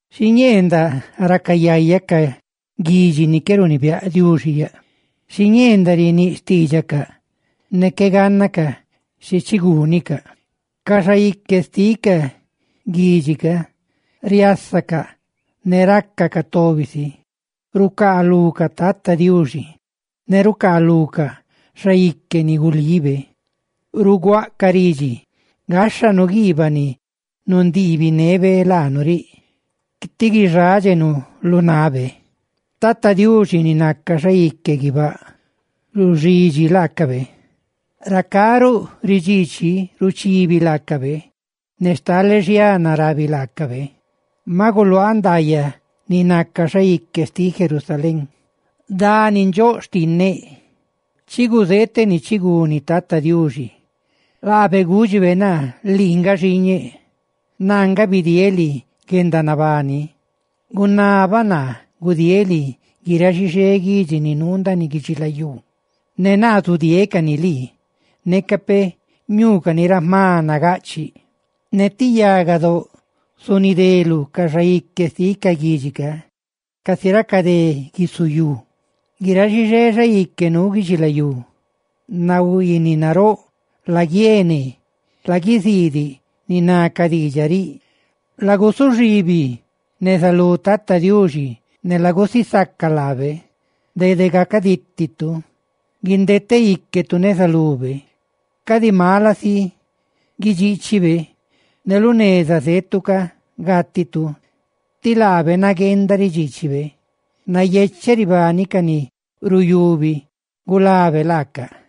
Xiñee ndaꞌ raca yaya ca guidxi ni qué runibiáꞌ Diuxi yaꞌ. Xiñee ndaꞌ riníꞌ xtiidxacaꞌ ne qué gánnacaꞌ xi chigúnicaꞌ. Ca xaique xtiꞌ ca guidxi ca riasacaꞌ ne racacaꞌ tobi si rucaalucaꞌ tata Diuxi, ne rucaalucaꞌ xaique ni gulibe. Ruguaꞌcaꞌ ridxi: «¡Gáxhanu guiibaꞌ ni nundiibinebe laanu riꞌ! ¡Tí guixádxenu lu nabe!» Tata Diuxi ni naca xaique guibáꞌ, ruxidxi laacabe; racá ruꞌ ridxiichi, ruchibi laacabe; ne stale xiana rabi laacabe: «Maꞌ guluaaꞌ ndaayaꞌ ni naca xaique xtiꞌ Sión, dani nandxóꞌ xtinneꞌ.» Chiguzeeteꞌ ni chiguni tata Diuxi. Laabe gúdxibe naa: «Lii nga xiiñeꞌ; naa nga bidieeꞌ lii guendanabani. Gunabaꞌ naa gudieeꞌ lii guiráꞌ xixé guidxi ni nuu ndaaniꞌ guidxilayú, ne naa zudieeꞌ cani lii, neca peꞌ ñuucani ra jma nagaꞌchiꞌ. Ne ti yagadóꞌa zunideluꞌ ca xaique xtiꞌ ca guidxi ca; ¡casi raca dé guisu yu!» Guiráꞌ xixé xaique nuu guidxilayú, nahuiiniꞌ naróꞌ, laguiene, ¡laguiziidiꞌ ni ná ca diidxaꞌ riꞌ! Lagusuxibi neza lu tata Diuxi ne lagusisaca laabe; dede gacadítitu guindete íquetu neza lube; cadi mala si guidxiichibe ne lu neza zetu ca gátitu, tí laabe nagueenda ridxiichibe. ¡Nayecheꞌ ribani ca ni ruyubi gulabe laacaꞌ!